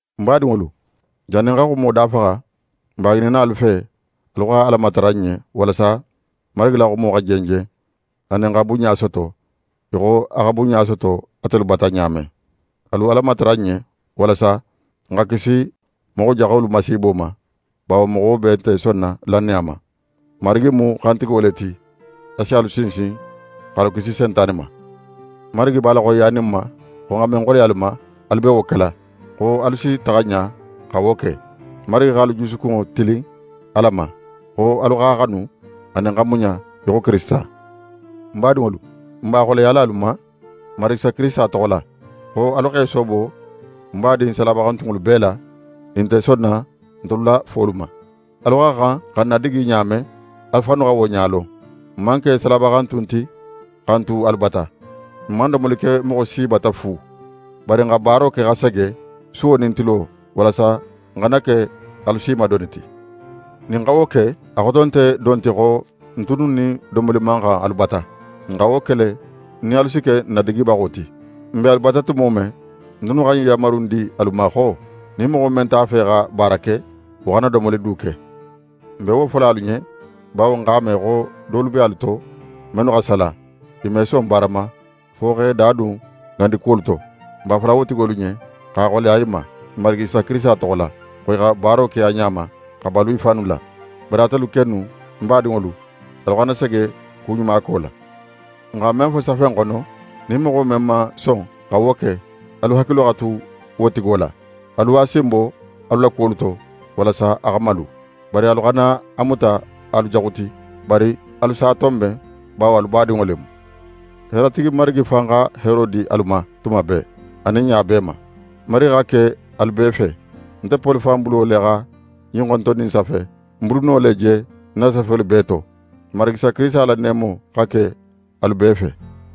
N badinŋolu, jannin n xa xumo dafaxa, n b'a ŋininna alu fe, alu xa Ala matara n ɲen, walasa Marigi la xumo xa jenjen, anin xa bunɲa soto, í xo a xa bunɲa soto atelu bata ɲa men. Alu Ala matara n ɲen, walasa n xa kisi moxo jaxolu masiibo ma, bawo moxo bee nte sonna lannaya ma. Marigi mu xantigo le ti. A si alu sinsin, x'alu kisi Sentane ma. Marigi b'a la xoyiyanin n ma, xo n xa men xoleya alu ma, alu be wo kela, xo alu si taxa ɲa xa wo ke. Marigi x'alu jusukunŋo tilin Ala ma, xo alu x'a xanu anin xa muɲa í xo Kirisita. N badinŋolu, n b'a xoleyala alu ma, Marigi Isa Kirisita toxo la, xo alu x'e soobo n badin salabaxantunŋolu bee la, nin i nte sonna ntelu la folu ma. Alu xa xan xa n nadigi ɲa men, alu fannu xa wo ɲa lon. N man ke salabaxantun ti xa n tu alu bata. N man domolo ke moxo si bata fu; bari n xa baaro ke xa sege, suwo nin tilo, walasa n xana ke alu si ma doni ti. Nin n xa wo ke, a xoto nte don ti xo n tunnu nin domoli man xan alu bata. N xa wo ke le, nin alu si ke n nadigibaxo ti. N be alu bata tumo men, n tunnu xa ɲin yanmaru in di alu ma xo: Nin moxo men nte a fe xa baara ke, wo xana domoli du ke. N be wo fola alu ɲen, bawo n x'a me xo dolu be alu to mennu xa sala. I me son baara ma, fo x'e da dun ŋandi kuwolu to. N b'a fola wo tigolu ɲen, x'a xoleya i ma Marigi Isa Kirisita toxo la, xo i xa baaro ke a ɲa ma, xa balu i fannu la. Bari atelu kennu n badinŋolu, alu xana sege kuɲumako la. N xa men fo safe in xono, nin moxo men man son xa wo ke, alu hakilo xa tu wo tigo la. Alu a sin bo alu la kuwolu to, walasa a xa malu. Bari alu xana a muta alu jaxu ti, bari alu s'a tonben; bawo alu badinŋo le mu. Heeratigi Marigi fan xa heero di alu ma tuma bee, anin ɲa bee ma. Marigi xa ke alu bee fe. Nte Poli fan bulo le xa ɲin xontonni in safe. Ń buluno le je ń na safelu bee to. N Marigi Isa Kirisita la neemo xa ke alu bee fe.